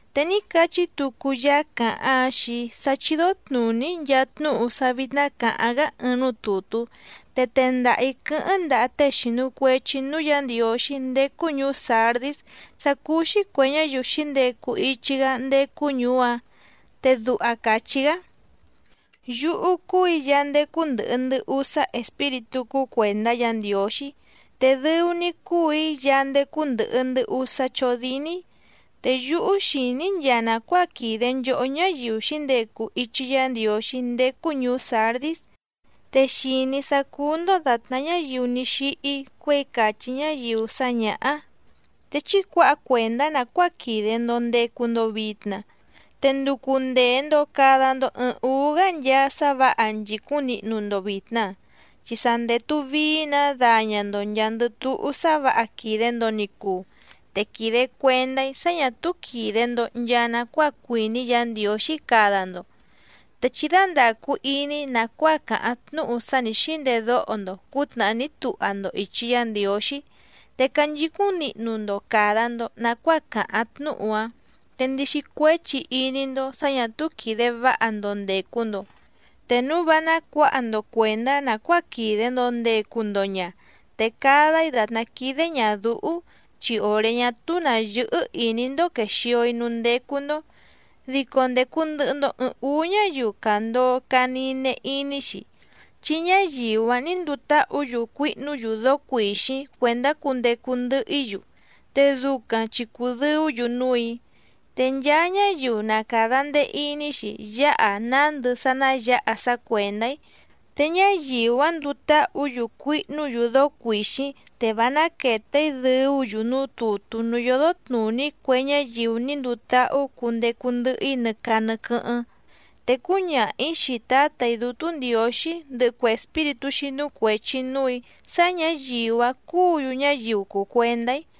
Te ní cachí tucu Yaá càháⁿ‑áⁿ xii‑í sá chídó tnùní‑í nchaa tnúhu sá vítná cǎháⁿ‑gá ɨɨⁿ núú tùtú, te tendaha‑ǐ quɨ́hɨ́ⁿ ndaha tée xìnu cuechi núú Yǎ Ndiǒxí ndécú ñùú Sǎrdís sá cúú‑xí cuè ñáyiu xǐndecu ichi‑gá ndécú ñùú‑áⁿ te duha càchí‑gá: “Yúhú cúù‑í Yaá ndécú ndɨ̀hɨ ndɨ usá espíritú cúú cuèndá Yǎ Ndiǒxí, te dɨu‑ni‑í cúù‑í Yaá ndécú ndɨ̀hɨ ndɨ usá chódíní. Te yúhú xìní‑í nchaa nàcuáa quìde nchohó ñáyiu xǐndecu ichi Yá Ndiǒxí ndécú ñùú Sǎrdís, te xìní‑í sá cúú‑ndó dàtná ñáyiu ní xíhí cuěi càchí ñáyiu sá ñǎhá. Te chí cuǎha cuèndá nàcuáa quìde‑ndo ndecu‑ndo vitna, te nducu ndèe‑ndo cada‑ndo ɨɨⁿ úú‑gá nchaa sá vǎha nchìcúⁿ nihnu‑ndo vìtna, chi sa ndètu vií‑nǎ daña‑ndo nchàa‑ndɨ túhú sá vǎha quìde‑ndo ni cuu, te quìde cuendá‑í sá ñà túú quìde‑ndo nchaa nacuáa cuìní Yǎ Ndiǒxí cada‑ndo. Te chí dándàcu iní nàcuáa càháⁿ tnúhu sá nǐ xíndedóho‑ndo cǔtnàhá ní tuha‑ndo ìchi Yá Ndiǒxí, te canchicúⁿ nihnu‑ndo càda‑ndo nacuáa càháⁿ tnúhu‑áⁿ, te ndixi cuéchi iní‑ndó sǎ ñà túú quìde váha‑ndo ndècu‑ndo, te núu vá nácuǎha‑ndo cuèndá nàcuáa quìde‑ndo ndecu‑ndo ña, te cada‑í dàtná quídé ñàdúhú, chi òré ñá túú nǎ yɨ́hɨ́ ìní‑ndó quèxio‑í núú ndécú‑ndó. Dico ndècu ndɨhɨ‑ndo ɨɨⁿ úú ñáyiu càndoo caa nine iní‑xi, chi ñáyiu‑áⁿ nǐ nduu táhǔ‑yu cuihnú‑yu dóó cuìxíⁿ cuèndá cundecu ndɨhɨ‑í‑yu, te ducaⁿ chi cùdɨú‑yu núù‑í. Te nchaa ñáyiu na càda ndee iní‑xi yáha nándɨ sá ná yǎha sá cuèndá‑í, te ñáyiu‑áⁿ nduu táhǔ‑yu cuihnú‑yu dóó cuìxíⁿ, te vá náquète‑í dɨ̀ú‑yu núú tùtú núú yódó tnùní cue ñáyiu ní nduu táhú cundecu ndɨhɨ‑í nɨ caa nɨ quɨ́hɨ́ⁿ, te cúñaha‑ǐ xii Tǎtà‑í Dútú Ndiǒxí ndɨhɨ cue espíritú xínú cuèchi núù‑í sá ñǎyiu‑áⁿ cúǔ‑yu ñáyiu cùu cuendá‑í.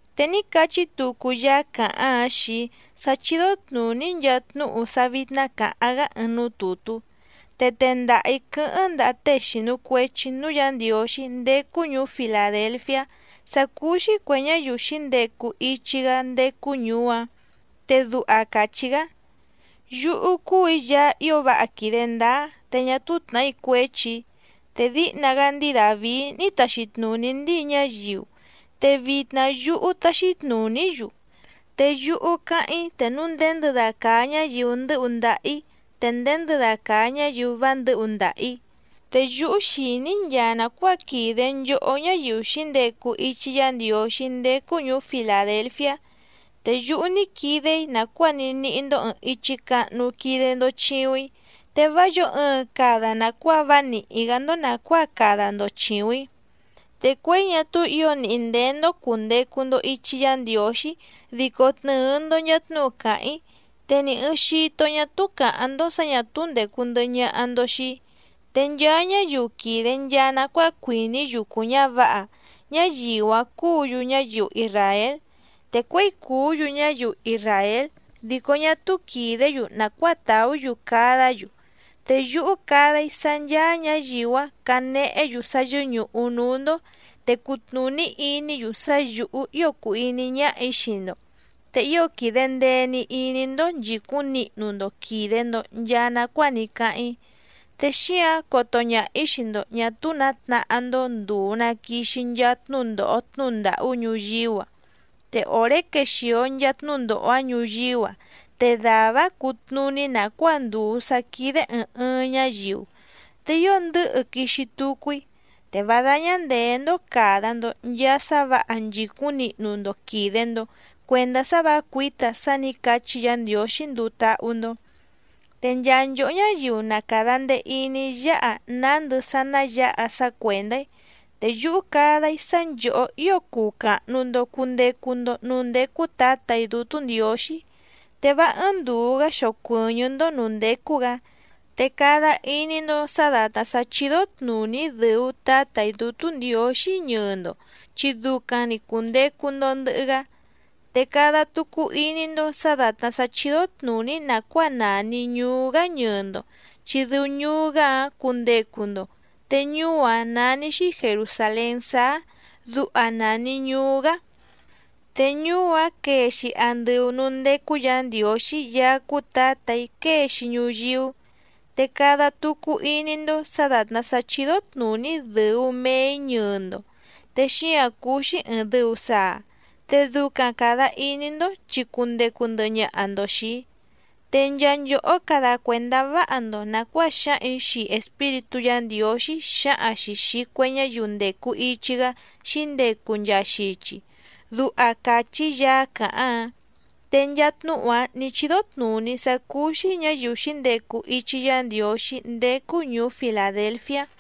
Te ní cachí tucu Yaá càháⁿ‑áⁿ xii‑í sá chídó tnùní‑í nchaa tnúhu sá vítná cǎháⁿ‑gá ɨɨⁿ núú tùtú, te tendaha‑ǐ quɨ́hɨ́ⁿ ndaha tée xìnu cuechi núú Yǎ Ndiǒxí ndécú ñùú Filàdelfiá sá cúú‑xí cuè ñáyiu xǐndecu ichi‑gá ndécú ñùú‑áⁿ, te duha càchí‑gá: “Yúhú cúù‑í Yaá ío váha quìde ndáá te ñá túú tnàhí cuéchi‑í. Te díhna‑gá ndíi Dàvií ní taxi tnùní ndíi ñáyiu, te vitna yúhú táxí tnùní‑í‑yu, te yúhú cáháⁿ‑í te núu nděndɨda càa ñáyiu ndɨ́hu ndaha‑ǐ te nděndɨda càa ñáyiu vá ndɨ̌hu ndaha‑ǐ. Te yúhú xìní‑í nchaa nàcuáa quìde nchohó ñáyiu xǐndecu ichi Yá Ndiǒxí ndécú ñùú Filàdelfiá, te yúhú ní quide‑í nàcuáa ní níhí‑ndó ɨ̀ɨⁿ ichi cahnu quide‑ndo chiuⁿ‑í, te vá yǒo ɨɨⁿ cada nàcuáa vá nìhí‑gá‑ndó nàcuáa cada‑ndo chìuⁿ‑í. Te cuěi ñá túú ǐo nìhí ndéé‑ndó cùndecu‑ndo ichi Yá Ndiǒxí dico tnɨ̀ɨ‑ndo nchaa tnúhu càháⁿ‑í, te ni ɨ̀ɨⁿ xito ñá túú càháⁿ‑ndó sǎ ñà túú ndècu ndɨhɨ ñaha‑ndo xii‑í. Te nchaa ñáyiu quìde nchaa nacuáa cuìní yucu ñǎvǎha, ñáyiu‑áⁿ cúǔ‑yu ñáyiu isràél, te cuěi cùú‑yu ñáyiu isràél dico ñá túú quìdé‑yu nàcuáa tàú‑yu cadá‑yu, te yúhú cada‑í sá ncháá ñǎyiu‑áⁿ canehé‑yu sá yɨ́ñùhu núú‑ndó, te cutnùní iní‑yu sá yǔhú ío cùu iní ñáhà‑í xii‑ndo. Te ío quìde ndee‑ni iní‑ndó nchìcúⁿ nihnu‑ndo quìde‑ndo nchaa nacuáa ní cáháⁿ‑í, te xíǎⁿ coto ñaha‑ǐ xii‑ndo ñà túú nǎ tnahá‑ndó ndùu na quixi nchaa tnúndòho tnúhu ndàhú ñuyíú‑a. Te òré quexìo nchaa tnúndòho‑áⁿ ñuyíú‑a te dàvá‑áⁿ cutnùní nàcuáa ndùu sá quídé ɨ̀ɨⁿ ɨɨⁿ ñáyiu. Te ío ndɨ̌hɨ quixi tucu‑í. Te vá dáñá ndèé‑ndó càda‑ndo nchaa sá vǎha nchìcúⁿ nihnu‑ndo quìde‑ndo cuendá sá vǎ cuǐta sá nǐ cachí Yǎ Ndiǒxí nduu táhú‑ndó. Te nchaa nchòhó ñáyiu na càda ndee iní yáha nándɨ sá ná yǎha sá cuèndá‑í, te yúhú cada‑í sá nchòhó ío cuu càhnu‑ndo cundecu‑ndo núú ndécú Tǎtà‑í Dútú Ndiǒxí, te vá ɨ́ɨ́ⁿ ndùu‑gá xocuɨ̀ñɨ́‑ndó nǔú ndécú‑gǎ. Te cada iní‑ndó sǎ dàtná sá chídó tnùní‑í dɨ̀u Tátà‑í Dútú Ndiǒxí ñɨɨ‑ndo chi ducaⁿ‑ni cùndecu‑ndo ndɨhɨ‑gá, te cada tucu iní‑ndó sǎ dàtná sá chídó tnùní‑í nàcuáa nàni ñuú‑gá ñɨɨ‑ndo, chi dɨu ñuú‑gá‑áⁿ cundecu‑ndo, te ñuú‑áⁿ nání‑xí Jèrusalén Sáá, duha nàni ñuú‑gá. Te ñuú‑áⁿ quee‑xi andɨu nǔú ndécú Yǎ Ndiǒxí Yaá cúú Tǎtà‑í quée‑xi ñuyíú. Te cada tucu iní‑ndó sǎ dàtná sá chídó tnùní‑í dɨ̀u mee‑í ñɨɨ‑ndo, te xíǎⁿ cúú‑xí ɨ̀ɨⁿ dɨu saa, te ducaⁿ càda iní‑ndó chi cundecu ndɨhɨ ñaha‑ndo xìi‑í. Te nchaa nchòhó cada cuèndá váha‑ndo nàcuáa xǎhaⁿ‑ǐ xii Espíritú Yǎ Ndiǒxí xǎhaⁿ‑xi xìi cue ñáyiu ndècu ichi‑gá xǐndecu nchaa xichi”, duha càchí Yaá càháⁿ‑áⁿ. Te nchaa tnúhu‑áⁿ nì chídó tnùní‑í sá cúú‑xí ñǎyiu xǐndecu ichi Yá Ndiǒxí ndécú ñùú Filàdelfiá.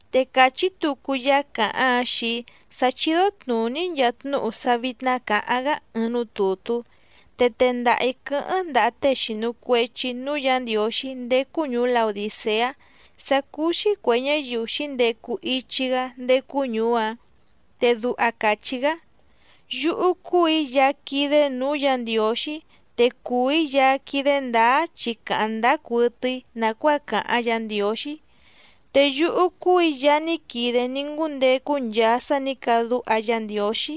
Te càchí tucu Yaá càháⁿ‑áⁿ xii‑í sá chídó tnùní‑í nchaa tnúhu sá vítná cǎháⁿ‑gá ɨɨⁿ núú tùtú, te tendaha‑ǐ quɨ́hɨ́ⁿ ndaha tée xìnu cuechi núú Yǎ Ndiǒxí ndécú ñùú Laodìceá sá cúú‑xí cuè ñáyiu xǐndecu ichi‑gá ndécú ñùú‑áⁿ, te duha càchí‑gá: “Yúhú cúù‑í Yaá quídé nǔú Yǎ Ndiǒxí, te cùu‑í Yaá quídé ndǎá chi càháⁿ ndáá cuɨtɨ‑í nàcuáa càháⁿ Yǎ Ndiǒxí. Te yúhú cúù‑í Yaá ní quide ní ngúndecu nchaa sá nǐ cadúha Yá Ndiǒxí.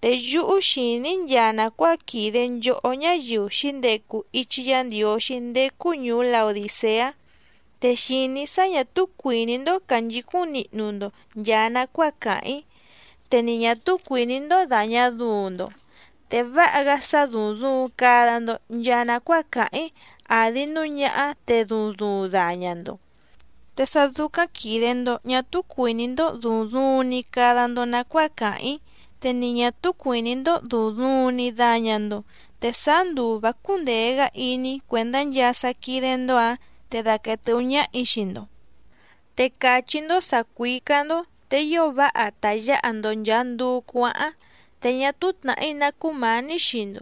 Te yúhú xìní‑í nchaa nàcuáa quìde nchohó ñáyiu xǐndecu ichi Yá Ndiǒxí ndécú ñùú Laodìceá, te xìní‑í sá ñà túú cuìní‑ndó cànchicúⁿ nihnu‑ndo nchàa nacuáa càháⁿ‑í, te ni ñà túú cuìní‑ndó dàña duuⁿ‑ndo. Te váha‑gá sá dúúⁿ dùuⁿ cada‑ndo nchaa nacuáa càháⁿ‑í àdi núu ñáhá te duuⁿ duuⁿ daña‑ndo. Te sá dúcáⁿ quìde‑ndo ñá túú cuìní‑ndó dùuⁿ duuⁿ‑ni cada‑ndo nàcuáa càháⁿ‑í, te ni ñà túú cuìní‑ndó dùuⁿ duuⁿ‑ni daña‑ndo te sáá nduu vǎ cúndèe‑gá iní‑í cuèndá nchaa sá quídé‑ndó‑ǎⁿ, te daquèe tɨ́hú ñáhà‑í xii‑ndo. Te càchí‑ndó sǎ cuícá‑ndó, te ío váha ta yǎha‑ndo nchàa nduu cuáháⁿ, te ñá túú tnàhí ná cúmǎní xii‑ndo,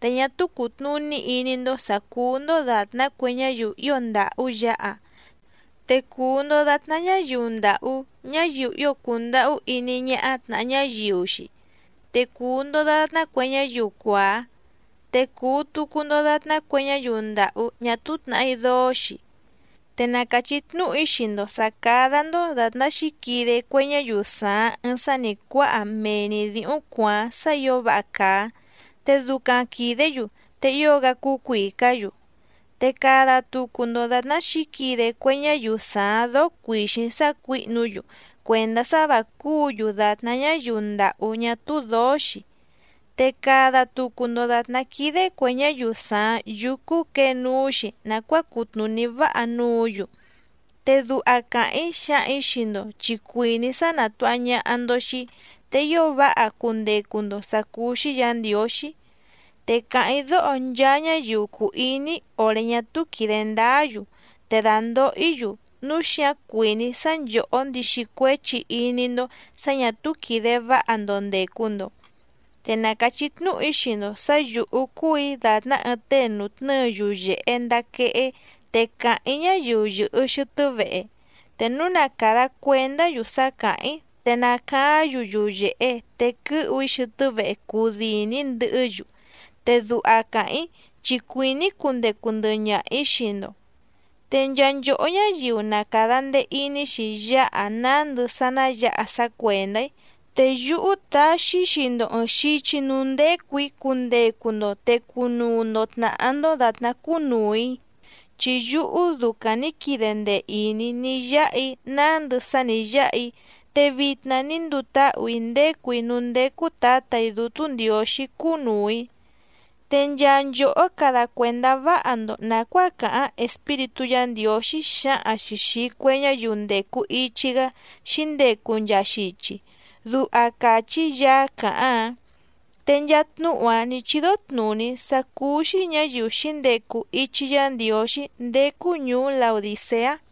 te ñá túú cùtnuní iní‑ndó sǎ cúú‑ndó dàtná cue ñáyiu ío ndàhú yǎha, te cùu‑ndo datná ñáyiu ndàhú, ñáyiu ío cùndahú iní ñáhá tnàha ñáyiu‑xi, te cùu‑ndo datná cue ñáyiu cuàá, te cùu tucu‑ndo datná cue ñáyiu ndàhú ñá túú tnàhí dóó‑xi. Te na càchí tnúhu‑í xii‑ndo sǎ cádá‑ndó dàtná xǐquide cue ñáyiu sàaⁿ ɨɨⁿ sá nǐ cuáha mee‑ni dǐhúⁿ cuàáⁿ sá ǐo váha càa, te ducaⁿ quìdé‑yu te ío‑gá cúú cuìcá‑yu. Te cada tucu‑ndo dàtná xǐquide cue ñáyiu sàaⁿ dóó cuìxíⁿ sácuǐhnu‑yu cuèndá sá vǎ cúǔ‑yu dàtná ñáyiu ndàhú ñá túú dǒó‑xi, te cada tucu‑ndo dàtná quídé cuè ñáyiu sàaⁿ yúcú quěe núú‑xi nàcuáa cutnùní váha núǔ‑yu, te duha càháⁿ‑í xǎhaⁿ‑ǐ xii‑ndo chi cuìní‑í sá nàtuha ñaha‑ndo xii‑í, te ío váha cundecu‑ndo sǎ cúú‑xí Yǎ Ndiǒxí. Te càháⁿ‑í dóho nchaa ñáyiu cùu iní‑í òré ñá túú quìde ndáá‑yu, te dàndoho‑í‑yu, núu xíǎⁿ cuìní‑í sá nchòhó ndixi cuéchi iní‑ndó sǎ ñà túú quìde váha‑ndo ndècu‑ndo. Te na càchí tnúhu‑í xii‑ndo sǎ yǔhú cúù‑í dàtná ɨɨⁿ tée nùtnɨ́ɨ yuyèhe ndaa quehé te càháⁿ‑í ñáyiu yɨ̀hɨ xɨtɨ́ vehe, te núu na càda cuendá‑yu sá càháⁿ‑í te nacaáⁿ‑yu yuyèhe te quɨ́hu‑í xɨtɨ́ vehe cudìni‑í ndɨhɨ́‑yu, te duha càháⁿ‑í chi cuìní‑í cundecu ndɨhɨ ñaha‑ǐ xii‑ndo. Te nchaa nchòhó ñáyiu na càda ndee iní‑xi yáha nándɨ sá ná yǎha sá cuèndá‑í, te yúhú taxi‑í xii‑ndo ɨ̀ɨⁿ xichi núú ndécù‑í cundecu‑ndo te cunuu‑ndo tnàhá‑ndó dàtná cúnùu‑í, chi yúhú ducaⁿ nǐ quide ndee ìní‑í ní yáha‑í nándɨ sá nǐ yáha‑í te vitna ní nduu táhù‑í ndécù‑í núú ndécú Tǎtà‑í Dútú Ndiǒxí cúnùu‑í. Te nchaa nchòhó cada cuèndá váha‑ndo nàcuáa càháⁿ Espíritú Yǎ Ndiǒxí xǎhaⁿ‑xi xìi cue ñáyiu ndècu ichi‑gá xǐndecu nchaa xichi”, duha càchí Yaá càháⁿ‑áⁿ. Te nchaa tnúhu‑áⁿ nǐ chídó tnùní‑í sá cúú‑xí ñǎyiu xǐndecu ichi Yá Ndiǒxí ndécú ñùú Laodìceá.